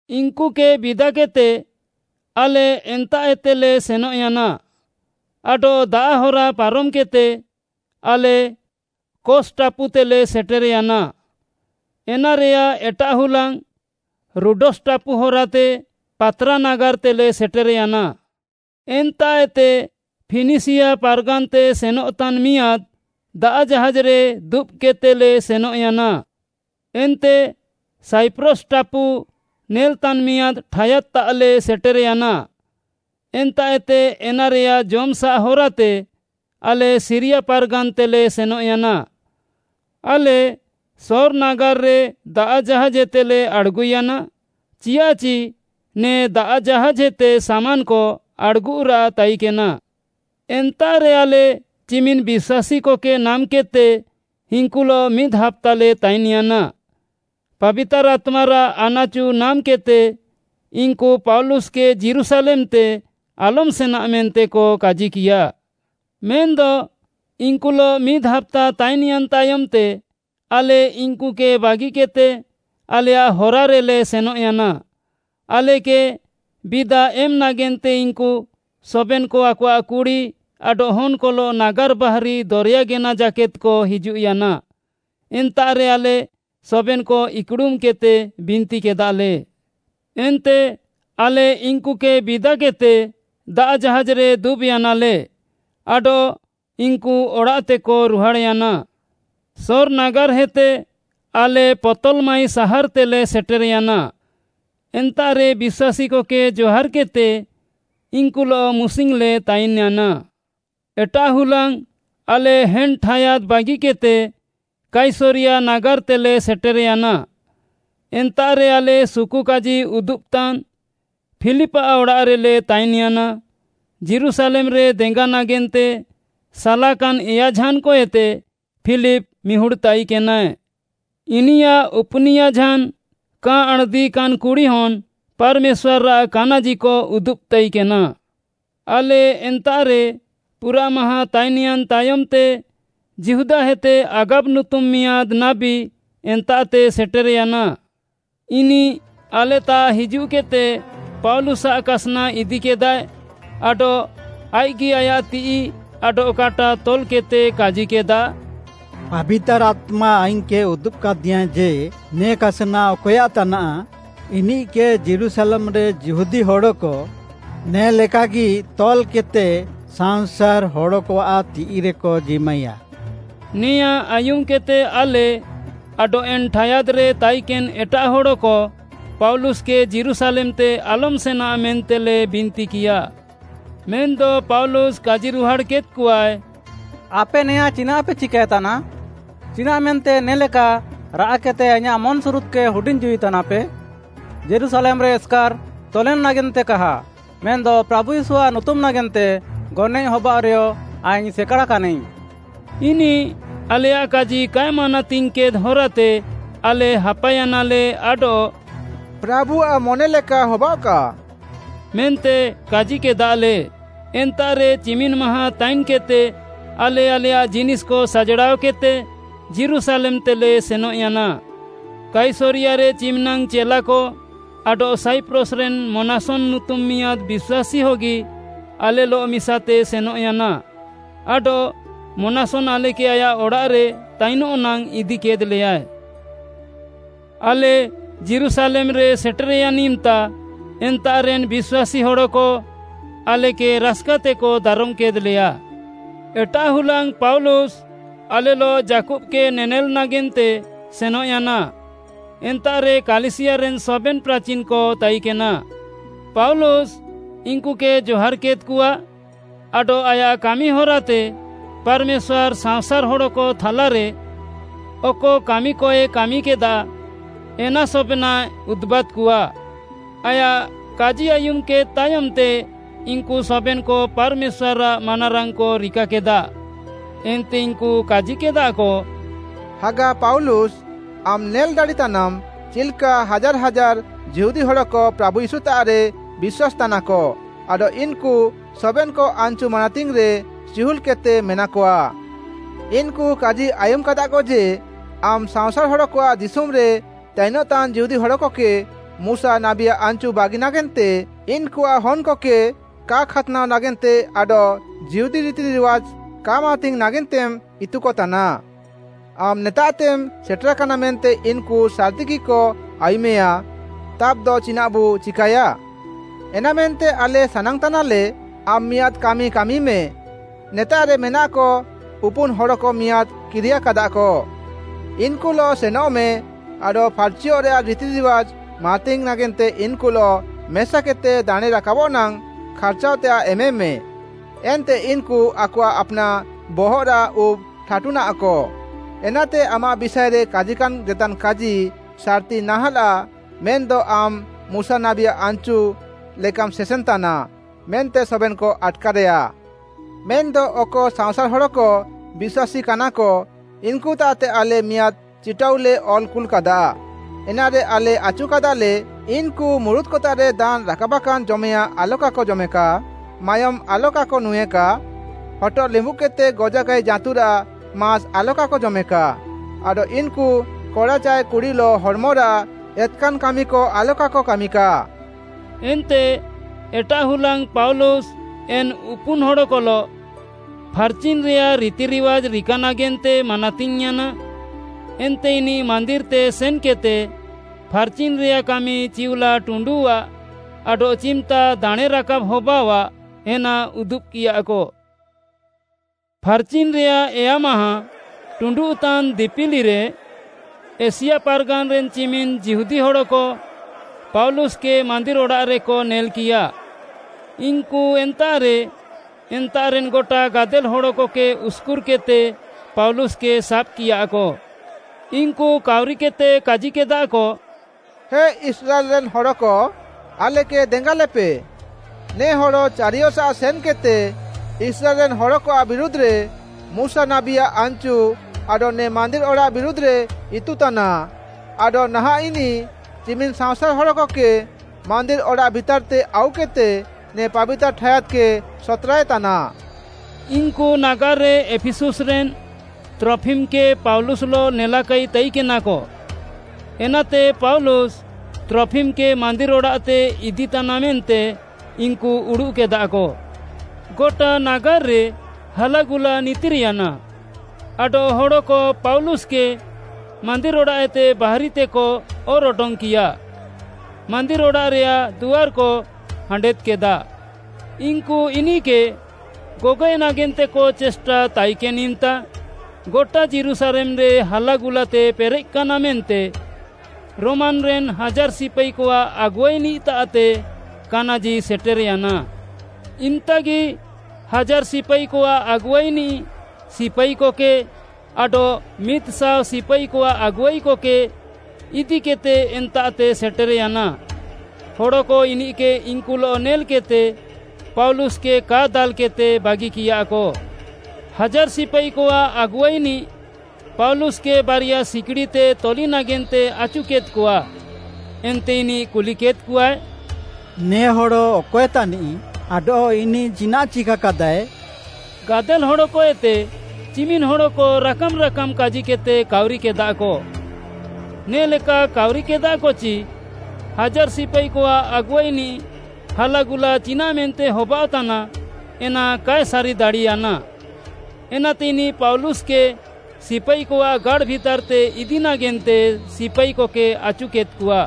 ଇନ୍‌କୁକେ ବିଦାକେଦ୍‌ତେ ଆଲେ ଏନ୍ତାଃଏତେଲେ ସେନଃୟାନା। ଆଡଃ ଦାଆଃ ହରା ପାରମ୍‌କେଦ୍‌ତେ ଆଲେ କୋସ୍‌ ଟାପୁତେଲେ ସେଟେର୍‌ୟାନା। ଏନାରେୟାଃ ଏଟାଃ ହୁଲାଙ୍ଗ୍‌ ରୋଡସ୍‌ ଟାପୁ ହରାତେ ପାତ୍‌ରା ନାଗାର୍‌ତେଲେ ସେଟେର୍‌ୟାନା। ଏନ୍ତାଃଏତେ ଫିନିସିୟା ପାର୍‌ଗାନ୍‌ତେ ସେନଃତାନ୍‌ ମିଆଁଦ୍‌ ଦାଆଃ ଜାହାଜ୍‌ରେ ଦୁବ୍‌କେଦ୍‌ତେଲେ ସେନଃୟାନା। ଏନ୍ତେ ସାଇପ୍ରସ୍‌ ଟାପୁ ନେଲ୍‍ତାନ୍‌ ମିଆଁଦ୍‌ ଠାୟାଦ୍‌ତାଃଲେ ସେଟେର୍‌ୟାନା। ଏନ୍ତାଃଏତେ ଏନାରେୟାଃ ଜମ୍‌ସାଃ ହରାତେ ଆଲେ ସିରିୟା ପାର୍‌ଗାନ୍‌ତେଲେ ସେନଃୟାନା। ଆଲେ ସୋର୍‌ ନାଗାର୍‌ରେ ଦାଆଃ ଜାହାଜ୍‌ଏତେଲେ ଆଡ଼୍‌ଗୁୟାନା, ଚିଆଃଚି ନେ ଦାଆଃ ଜାହାଜ୍‌ଏତେ ସାମାନ୍‌କ ଆଡ଼୍‌ଗୁରାଃ ତାଇକେନା। ଏନ୍ତାଃରେ ଆଲେ ଚିମିନ୍‌ ବିଶ୍ୱାସୀକକେ ନାମ୍‌କେଦ୍‌ତେ ଇନ୍‌କୁଲଃ ମିଦ୍‌ ହାପ୍ତାଲେ ତାଇନ୍‌ୟାନା। ପାବିତାର୍‌ ଆତ୍ମାରାଃ ଆନାଚୁ ନାମ୍‌କେଦ୍‌ତେ ଇନ୍‌କୁ ପାଉଲୁସ୍‌କେ ଯୀରୁଶାଲେମ୍‌ତେ ଆଲମ୍‌ ସେନା ମେନ୍ତେକ କାଜିକିୟା। ମେନ୍‌ଦ ଇନ୍‌କୁଲଃ ମିଦ୍‌ ହାପ୍ତା ତାଇନ୍‌ୟାନ୍‌ ତାୟମ୍‌ତେ, ଆଲେ ଇନ୍‌କୁକେ ବାଗିକେଦ୍‌ତେ ଆଲେୟାଃ ହରାରେଲେ ସେନଃୟାନା। ଆଲେକେ ବିଦା ଏମ୍‌ ନାଗେନ୍ତେ ଇନ୍‌କୁ ସବେନ୍‌କ ଆକଆଃ କୁଡ଼ି ଆଡଃ ହନ୍‌କଲଃ ନାଗାର୍‌ ବାହାରି ଦରେୟା ଗେନା ଜାକେଦ୍‌କ ହିଜୁଃୟାନା। ଏନ୍ତାଃରେ ଆଲେ ସବେନ୍‌କ ଇକ୍‌ଡ଼ୁମ୍‌କେଦ୍‌ତେ ବିନ୍ତିକେଦାଲେ। ଏନ୍ତେ ଆଲେ ଇନ୍‌କୁକେ ବିଦାକେଦ୍‌ତେ, ଦାଆଃ ଜାହାଜ୍‌ରେ ଦୁବ୍‌ୟାନାଲେ ଆଡଃ ଇନ୍‌କୁ ଅଡ଼ାଃତେକ ରୁହାଡ଼୍‌ୟାନା। ସୋର୍‌ ନାଗାର୍‌ହେତେ ଆଲେ ପତଲ୍‌ମାଇ ସାହାର୍‌ତେଲେ ସେଟେର୍‌ୟାନା, ଏନ୍ତାଃରେ ବିଶ୍ୱାସୀକକେ ଜହାର୍‌କେଦ୍‌ତେ ଇନ୍‌କୁଲଃ ମୁସିଙ୍ଗ୍‌ଲେ ତାଇନ୍‌ୟାନା। ଏଟାଃ ହୁଲାଙ୍ଗ୍‌ ଆଲେ ଏନ୍‌ ଠାୟାଦ୍‌ ବାଗିକେଦ୍‌ତେ କାଇସରିୟା ନାଗାର୍‌ତେଲେ ସେଟେର୍‌ୟାନା। ଏନ୍ତାଃରେ ଆଲେ ସୁକୁକାଜି ଉଦୁବ୍‌ତାନ୍‌ ଫିଲିପ୍‌ଆଃ ଅଡ଼ାଃରେଲେ ତାଇନ୍‌ୟାନା, ଯୀରୁଶାଲେମ୍‌ରେ ଦେଙ୍ଗା ନାଗେନ୍ତେ ସାଲାକାନ୍‌ ଏୟାଝାନ୍‌କଏତେ ଫିଲିପ୍‌ ମିହୁଡ଼୍‌ ତାଇକେନାଏ। ଇନିୟାଃ ଉପୁନିୟାଝାନ୍ କା ଆଣ୍‌ଦିକାନ୍‌ କୁଡ଼ିହନ୍‍ ପାର୍‌ମେଶ୍ୱାର୍‌ଆଃ କାନାଜିକ ଉଦୁବ୍‌ ତାଇକେନା। ଆଲେ ଏନ୍ତାଃରେ ପୁରାଃ ମାହାଁ ତାଇନ୍‌ୟାନ୍‌ ତାୟମ୍‌ତେ, ଯିହୁଦାଏତେ ଆଗାବ ନୁତୁମ୍‌ ମିଆଁଦ୍‌ ନାବୀ ଏନ୍ତାଃତେ ସେଟେର୍‌ୟାନା। ଇନିଃ ଆଲେତାଃ ହିଜୁଃକେଦ୍‌ତେ, ପାଉଲୁସ୍‌ଆଃ କାସ୍‌ନା ଇଦିକେଦାଏ, ଆଡଃ ଆଇଃକ୍‌ଗି ଆୟାଃ ତିଃଇ ଆଡଃ କାଟା ତଲ୍‌କେଦ୍‌ତେ କାଜିକେଦା, “ପାବିତାର୍‌ ଆତ୍ମା ଆଇଙ୍ଗ୍‌କେ ଉଦୁବ୍‌କାଦିୟାଁ ଯେ, ନେ କାସ୍‌ନା ଅକଏୟାଃ ତାନାଃ, ଇନିଃକେ ଯୀରୁଶାଲେମ୍‌ରେ ଯିହୁଦୀ ହଡ଼କ ନେ'ଲେକାଗି ତଲ୍‌କେଦ୍‌ତେ ସାଅଁସାର୍‌ ହଡ଼କଆଃ ତିଃଇରେକ ଜିମାଇୟା।” ନେଆଁଁ ଆୟୁମ୍‌କେଦ୍‌ତେ ଆଲେ ଆଡଃ ଏନ୍‌ ଠାୟାଦ୍‌ରେ ତାଇକେନ୍‌ ଏଟାଃ ହଡ଼କ ପାଉଲୁସ୍‌କେ ଯୀରୁଶାଲେମ୍‌ତେ ଆଲମ୍‌ ସେନା ମେନ୍ତେଲେ ବିନ୍ତିକିୟା। ମେନ୍‌ଦ ପାଉଲୁସ୍‌ କାଜିରୁହାଡ଼୍‌କେଦ୍‍କଆଏ, “ଆପେ ନେଆଁ ଚିନାଃପେ ଚିକାଏତାନା? ଚିନାଃମେନ୍ତେ ନେ ଲେକା ରାଆଃକେଦ୍‌ତେ ଆଇଁୟାଃ ମନ୍‌ସୁରୁଦ୍‌କେ ହୁଡିଙ୍ଗ୍‌ ଜୀଉ ତାନାପେ? ଯୀରୁଶାଲେମ୍‌ରେ ଏସ୍‌କାର୍‌ ତଲେନ୍‌ ନାଗେନ୍ତେ କାହା, ମେନ୍‌ଦ ପ୍ରାଭୁ ୟୀଶୁଆଃ ନୁତୁମ୍‌ ନାଗେନ୍ତେ ଗନଏଃ ହବାଅଃରେୟ ଆଇଙ୍ଗ୍‌ ସେକାଡ଼୍‌କାନାଇଙ୍ଗ୍‌।” ଇନିଃ ଆଲେୟାଃ କାଜି କାଏ ମାନାତିଙ୍ଗ୍‌କେଦ୍‌ ହରାତେ ଆଲେ ହାପାୟାନାଲେ ଆଡଃ “ପ୍ରାଭୁଆଃ ମନେଲେକା ହବାଅଃକା” ମେନ୍ତେ କାଜିକେଦାଲେ। ଏନ୍ତାଃରେ ଚିମିନ୍‌ ମାହାଁ ତାଇନ୍‌କେଦ୍‌ତେ ଆଲେ ଆଲେୟାଃ ଜିନିଷ୍‌କ ସାଜ୍‌ଡ଼ାଅକେଦ୍‌ତେ ଯୀରୁଶାଲେମ୍‌ତେଲେ ସେନଃୟାନା। କାଇସରିୟାରେ ଚିମିନାଙ୍ଗ୍‌ ଚେଲାକ ଆଡଃ ସାଇପ୍ରସ୍‌ରେନ୍‌ ମନାସନ୍‌ ନୁତୁମ୍‌ ମିଆଁଦ୍‌ ବିଶ୍ୱାସୀହଗି ଆଲେଲଃ ମିସାତେ ସେନଃୟାନା। ଆଡଃ ମନାସନ୍‌ ଆଲେକେ ଆୟାଃ ଅଡ଼ାଃରେ ତାଇନଃ ନାଙ୍ଗ୍‌ ଇଦିକେଦ୍‌ଲେୟାଏ। ଆଲେ ଯୀରୁଶାଲେମ୍‌ରେ ସେଟେର୍‌ୟାନ୍‌ ଇମ୍‌ତା ଏନ୍ତାଃରେନ୍‌ ବିଶ୍ୱାସୀ ହଡ଼କ ଆଲେକେ ରାସ୍‌କାତେକ ଦାରମ୍‌କେଦ୍‌ଲେୟା। ଏଟାଃ ହୁଲାଙ୍ଗ୍‌ ପାଉଲୁସ୍‌ ଆଲେଲଃ ଯାକୁବ୍‌କେ ନେନେଲ୍‌ ନାଗେନ୍ତେ ସେନଃୟାନା, ଏନ୍ତାଃରେ କାଲିସିୟାରେନ୍‌ ସବେନ୍‌ ପ୍ରାଚିନ୍‌କ ତାଇକେନା। ପାଉଲୁସ୍‌ ଇନ୍‌କୁକେ ଜହାର୍‌କେଦ୍‌କଆ ଆଡଃ ଆୟାଃ କାମି ହରାତେ ପାର୍‌ମେଶ୍ୱାର୍‌ ସାଅଁସାର୍‌ ହଡ଼କ ଥାଲାରେ ଅକ କାମିକଏ କାମିକେଦା, ଏନା ସବେନାଃଏ ଉଦୁବାଦ୍‌କଆ। ଆୟାଃ କାଜି ଆୟୁମ୍‌କେଦ୍‌ ତାୟମ୍‌ତେ ଇନ୍‌କୁ ସବେନ୍‌କ ପାର୍‌ମେଶ୍ୱାର୍‌ଆଃ ମାନାରାଙ୍ଗ୍‌କ ରିକାକେଦା। ଏନ୍ତେ ଇନ୍‌କୁ କାଜିକେଦାକ, “ହାଗା ପାଉଲୁସ୍‌, ଆମ୍‌ ନେଲ୍‌ ଦାଡ଼ିତାନାମ୍‌, ଚିଲ୍‌କା ହାଜାର୍‌ ହାଜାର୍‌ ଯିହୁଦୀ ହଡ଼କ ପ୍ରାଭୁ ୟୀଶୁତାଃରେ ବିଶ୍ୱାସ୍‌ତାନାକ ଆଡଃ ଇନ୍‌କୁ ସବେନ୍‌କ ଆନ୍‌ଚୁ ମାନାତିଙ୍ଗ୍‌ରେ ଚିହୁଲ୍‌କେଦ୍‌ତେ ମେନାକଆ। ଇନ୍‌କୁ କାଜି ଆୟୁମ୍‌କାଦାକ ଯେ, ଆମ୍‌ ସାଅଁସାର୍‌ ହଡ଼କଆଃ ଦିଶୁମ୍‌ରେ ତାଇନ୍‌ତାନ୍‌ ଯିହୁଦୀ ହଡ଼କକେ ମୁଶା ନାବୀଆଃ ଆନ୍‌ଚୁ ବାଗି ନାଗେନ୍ତେ, ଇନ୍‌କୁଆଃ ହନ୍‌କକେ କା ଖାତ୍‌ନାଅ ନାଗେନ୍ତେ ଆଡଃ ଯିହୁଦୀ ରିତିରିୱାଜ୍‌ କା ମାନାତିଙ୍ଗ୍‌ ନାଗେନ୍ତେମ୍‌ ଇତୁକତାନା। ଆମ୍‌ ନେତାଃତେମ୍‌ ସେଟେରାକାନା ମେନ୍ତେ ଇନ୍‌କୁ ସାର୍‌ତିଗିକ ଆୟୁମେୟା। ତାବ୍‌ଦ ଚିନାଃବୁ ଚିକାଏୟା? ଏନାମେନ୍ତେ ଆଲେ ସାନାଙ୍ଗ୍‌ତାନାଲେ, ଆମ୍‌ ମିଆଁଦ୍‌ କାମି କାମିମେ, ନେତାଃରେ ମେନାକ ଉପୁନ୍‌ ହଡ଼କ ମିଆଁଦ୍‌ କିରିୟାକାଦାକ। ଇନ୍‌କୁଲଃ ସେନଃମେ ଆଡଃ ଫାର୍‌ଚିଅଃରେୟାଃ ରିତିରିୱାଜ୍‌ ମାନାତିଙ୍ଗ୍‌ ନାଗେନ୍ତେ ଇନ୍‌କୁଲଃ ମେସାକେଦ୍‌ତେ ଦାଣେଁରାକାବଃ ନାଙ୍ଗ୍‌ ଖାର୍ଚାଅଃତେୟାଃ ଏମେମେ, ଏନ୍ତେ ଇନ୍‌କୁ ଆକଆଃ ଆପ୍‌ନାଃ ବହଃରାଃ ଉବ୍‌ ଟାଠୁନାଃକ। ଏନାତେ ଆମାଃ ବିଷାଏରେ କାଜିକାନ୍‌ ଜେତାନ୍‌ କାଜି ସାର୍‌ତି ନାହାଁଲାଃ, ମେନ୍‌ଦ ଆମ୍‌ ମୁଶା ନାବୀଆଃ ଆନ୍‌ଚୁ ଲେକାମ୍‌ ସେସେନ୍‌ତାନା, ମେନ୍ତେ ସବେନ୍‌କ ଆଟ୍‌କାରେୟା। ମେନ୍‌ଦ ଅକ ସାଅଁସାର୍‌ ହଡ଼କ ବିଶ୍ୱାସୀକାନାକ, ଇନ୍‌କୁତାଃତେ ଆଲେ ମିଆଁଦ୍‌ ଚିଟାଉଲେ ଅଲ୍‌ କୁଲ୍‌କାଦା, ଏନାରେ ଆଲେ ଆଚୁକାଦାଲେ, ଇନ୍‌କୁ ମୁରୁତ୍‌କତାଃରେ ଦାନ୍‌ ରାକାବାକାନ୍‌ ଜମେୟାଁଃ ଆଲକାକ ଜମେକା, ମାୟୋମ୍‌ ଆଲକାକ ନୁଁଏକା, ହଟଃ ଲିମ୍ବୁଦ୍‌କେଦ୍‌ତେ ଗଜାକାଇ ଜାଁତୁରାଃ ମାସ୍‌ ଆଲକାକ ଜମେକା ଆଡଃ ଇନ୍‌କୁ କଡ଼ା ଚାଏ କୁଡ଼ିଲଃ ହଡ଼୍‌ମରାଃ ଏତ୍‌କାନ୍‌ ସାମ୍ପାର୍କ୍‌କ ଆଲକାକ କାମିକା।” ଏନ୍ତେ ଏଟାଃ ହୁଲାଙ୍ଗ୍‌ ପାଉଲୁସ୍‌ ଏନ୍‌ ଉପୁନ୍‌ ହଡ଼କଲଃ ଫାର୍‌ଚିନ୍‌ରେୟାଃ ରିତିରିୱାଜ୍‌ ରିକା ନାଗେନ୍ତେ ମାନାତିଙ୍ଗ୍‌ୟାନା। ଏନ୍ତେ ଇନିଃ ମାନ୍ଦିର୍‌ତେ ସେନ୍‌କେଦ୍‌ତେ ଫାର୍‌ଚିନ୍‌ରେୟାଃ କାମି ଚିଉଲା ଟୁଣ୍ଡୁଃଆ ଆଡଃ ଚିମ୍‌ତା ଦାଣେଁରାକାବ୍‌ ହବାଅଃଆ, ଏନା ଉଦୁବ୍‌କିୟାକ। ଫାର୍‌ଚିନ୍‌ରେୟାଃ ଏୟାମାହ ଟୁଣ୍ଡୁଃତାନ୍‌ ଦିପିଲିରେ ଏସିଆ ପାର୍‌ଗାନ୍‌ରେନ୍‌ ଚିମିନ୍‌ ଯିହୁଦୀ ହଡ଼କ ପାଉଲୁସ୍‌କେ ମାନ୍ଦିର୍‌ ଅଡ଼ାଃରେକ ନେଲ୍‌କିୟା। ଇନ୍‌କୁ ଏନ୍ତାଃରେ, ଏନ୍ତାଃରେନ୍‌ ଗଟା ଗାଦେଲ୍‌ ହଡ଼କକେ ଉସ୍‌କୁର୍‌କେଦ୍‌ତେ ପାଉଲୁସ୍‌କେ ସାବ୍‌କିୟାକ। ଇନ୍‌କୁ କାଉରିକେଦ୍‌ତେ କାଜିକେଦାକ, “ହେ ଇସ୍ରାଏଲ୍‌ରେନ୍‌ ହଡ଼କ, ଆଲେକେ ଦେଙ୍ଗାଲେପେ! ନେ ହଡ଼ ଚାରିୟସାଃ ସେନ୍‌କେଦ୍‌ତେ ଇସ୍ରାଏଲ୍‌ରେନ୍‌ ହଡ଼କଆଃ ବିରୁଧ୍‌ରେ, ମୁଶା ନାବୀଆଃ ଆନ୍‌ଚୁ ଆଡଃ ନେ ମାନ୍ଦିର୍‌ ଅଡ଼ାଃ ବିରୁଧ୍‌ରେ ଇତୁତାନା। ଆଡଃ ନାହାଁଃ ଇନିଃ ଚିମିନ୍‌ ସାଅଁସାର୍‌ ହଡ଼କକେ ମାନ୍ଦିର୍‌ ଅଡ଼ାଃ ଭିତାର୍‌ତେ ଆଉକେଦ୍‌ତେ ନେ ପାବିତାର୍‌ ଠାୟାଦ୍‌କେ ସତ୍‌ରାଏ ତାନା।” ଇନ୍‌କୁ ନାଗାର୍‌ରେ ଏଫିସୁସ୍‌ରେନ୍‌ ତ୍ରଫିମ୍‍କେ ପାଉଲୁସ୍‌ଲଃ ନେଲାକାଇ ତାଇକେନାକ, ଏନାତେ ପାଉଲୁସ୍‌ ତ୍ରଫିମ୍‌କେ ମାନ୍ଦିର୍‌ ଅଡ଼ାଃତେ ଇଦିତାନା ମେନ୍ତେ ଇନ୍‌କୁ ଉଡ଼ୁଃକେଦାକ। ଗଟା ନାଗାର୍‌ରେ ହାଲାଗୁଲା ନିତିର୍‌ୟାନା, ଆଡଃ ହଡ଼କ ପାଉଲୁସ୍‌କେ ମାନ୍ଦିର୍‌ ଅଡ଼ାଃଏତେ ବାହାରିତେକ ଅର୍‌ ଅଡଙ୍ଗ୍‌କିୟା। ମାନ୍ଦିର୍‌ ଅଡ଼ାଃରେୟାଃ ଦୁଆର୍‌କ ହାଣ୍ଡେଦ୍‌କେଦା। ଇନ୍‌କୁ ଇନିଃକେ ଗଗଏଃ ନାଗେନ୍ତେକ ଚେଷ୍ଟା ତାଇକେନ୍‌ ଇମ୍‌ତା ଗଟା ଯୀରୁଶାଲେମ୍‌ରେ ହାଲାଗୁଲାତେ ପେରେଃକାନା ମେନ୍ତେ ରୋମାନ୍‌ରେନ୍‌ ହାଜାର୍‌ ସିପାଇକଆଃ ଆଗୁଆଇନିଃତାଃତେ କାନାଜି ସେଟେର୍‌ୟାନା। ଇମ୍‍ତାଗି ହାଜାର୍‌ ସିପାଇକଆଃ ଆଗୁଆଇନିଃ ସିପାଇକକେ ଆଡଃ ମିଦ୍‌ଶାଅ ସିପାଇକଆଃ ଆଗୁଆଇକକେ ଇଦିକେଦ୍‌ତେ ଏନ୍ତାଃତେ ସେଟେର୍‌ୟାନା। ହଡ଼କ ଇନିଃକେ ଇନ୍‌କୁଲଃ ନେଲ୍‌କେଦ୍‌ତେ ପାଉଲୁସ୍‌କେ କା ଦାଲ୍‌କେଦ୍‌ତେ ବାଗିକିୟାକ। ହାଜାର୍‌ ସିପାଇକଆଃ ଆଗୁଆଇନିଃ ପାଉଲୁସ୍‌କେ ବାରିୟା ସିକ୍‌ଡ଼ିତେ ତଲି ନାଗେନ୍ତେ ଆଚୁକେଦ୍‌କଆ। ଏନ୍ତେ ଇନିଃ କୁଲିକେଦ୍‌କଆଏ, “ନେ ହଡ଼ ଅକଏ ତାନିଃ ଆଡଃ ଇନିଃ ଚିନାଃ ଚିକା କାଦାଏ?” ଗାଦେଲ୍‌ ହଡ଼କଏତେ ଚିମିନ୍‌ ହଡ଼କ ରାକାମ୍‌ ରାକାମ୍‌ କାଜିକେଦ୍‌ତେ କାଉରିକେଦାକ। ନେ'ଲେକା କାଉରିକେଦାକ ଚି, ହାଜାର୍‌ ସିପାଇକଆଃ ଆଗୁଆଇନିଃ ହାଲାଗୁଲା ଚିନାଃମେନ୍ତେ ହବାଅଃତାନା ଏନା କାଏ ସାରିଦାଡ଼ିୟାନା। ଏନାତେ ଇନିଃ ପାଉଲୁସ୍‌କେ ସିପାଇକଆଃ ଗାଡ଼୍‌ ଭିତାର୍‌ତେ ଇଦି ନାଗେନ୍ତେ ସିପାଇକକେ ଆଚୁକେଦ୍‌କଆ।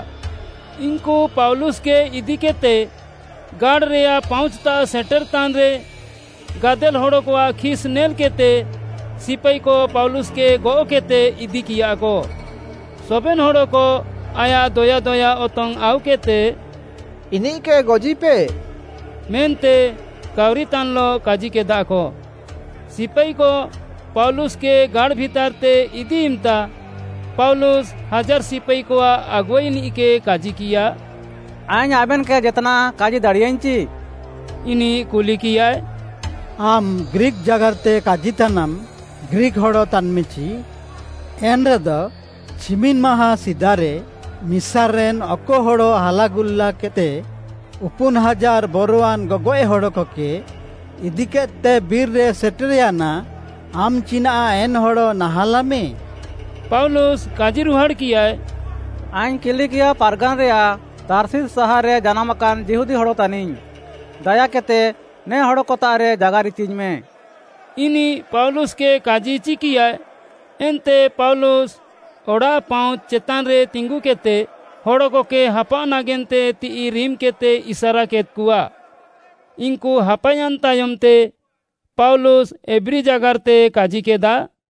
ଇନ୍‌କୁ ପାଉଲୁସ୍‌କେ ଇଦିକେଦ୍‌ତେ ଗାଡ଼୍‌ରେୟାଃ ପାଉଁଚ୍‌ତାଃ ସେଟେରଃତାନ୍‌ରେ ଗାଦେଲ୍‌ ହଡ଼କଆଃ ଖିସ୍‌ ନେଲ୍‌କେଦ୍‌ତେ ସିପାଇକ ପାଉଲୁସ୍‌କେ ଗଅଃକେଦ୍‌ତେ ଇଦିକିୟାକ। ସବେନ୍‌ ହଡ଼କ ଆୟାଃ ଦୟା ଦୟା ଅତଙ୍ଗ୍‌ ଆଉକେଦ୍‌ତେ “ଇନିଃକେ ଗଜିପେ” ମେନ୍ତେ କାଉରିତାନ୍‌ଲଃ କାଜିକେଦାକ। ସିପାଇକ ପାଉଲୁସ୍‌କେ ଗାଡ଼୍‌ ଭିତାର୍‌ତେ ଇଦି ଇମ୍‌ତା ପାଉଲୁସ୍‌ ହାଜାର୍‌ ସିପାଇକଆଃ ଆଗୁଆଇନିଃକେ କାଜିକିୟା, “ଆଇଙ୍ଗ୍‌ ଆବେନ୍‌କେ ଜେତ୍‌ନାଃ କାଜି ଦାଡ଼ିୟାଇଙ୍ଗ୍‌ଚି?” ଇନିଃ କୁଲିକିୟାଏ, “ଆମ୍‌ ଗ୍ରୀକ୍‌ ଜାଗାର୍‌ତେ କାଜିତାନାମ୍‌, ଗ୍ରୀକ୍‌ ହଡ଼ ତାନ୍‌ମେଚି? ଏନ୍‌ରେଦ ଚିମିନ୍‌ ମାହାଁ ସିଦାରେ ମିସାର୍‌ରେନ୍‌ ଅକ ହଡ଼ ହାଲାଗୁଲାକେଦ୍‌ତେ ଉପୁନ୍‌ ହାଜାର୍‌ ବରୱାନ୍‌ ଗଗଏଃ ହଡ଼କକେ ଇଦିକେଦ୍‌ତେ ବିର୍‌ରେ ସେଟେର୍‌ୟାନା, ଆମ୍‌ ଚିନାଃ ଏନ୍‌ ହଡ଼ ନାହାଁଲାମେ?” ପାଉଲୁସ୍‌ କାଜିରୁହାଡ଼୍‌କିୟାଏ, “ଆଇଙ୍ଗ୍‌ କିଲିକିଆ ପାର୍‌ଗାନ୍‌ରେୟାଃ ତାର୍ଷିସ୍‌ ସାହାର୍‌ରେ ଜାନାମାକାନ୍‌ ଯିହୁଦୀ ହଡ଼ ତାନିଙ୍ଗ୍‌। ଦାୟାକେଦ୍‌ତେ ନେ ହଡ଼କତାଃରେ ଜାଗାର୍‌ ଇଚିଙ୍ଗ୍‌ମେ।” ଇନିଃ ପାଉଲୁସ୍‌କେ କାଜି ଇଚିକିୟାଏ, ଏନ୍ତେ ପାଉଲୁସ୍‌ ଅଡ଼ାଃପାଉଁଚ୍‌ ଚେତାନ୍‌ରେ ତିଙ୍ଗୁକେଦ୍‌ତେ ହଡ଼କକେ ହାପାଅଃ ନାଗେନ୍ତେ ତିଃଇ ରିମ୍‌କେଦ୍‌ତେ ଇସାରାକେଦ୍‌କଆ। ଇନ୍‌କୁ ହାପାୟାନ୍‌ ତାୟମ୍‌ତେ ପାଉଲୁସ୍‌ ଏବ୍ରୀ ଜାଗାର୍‌ତେ କାଜିକେଦା,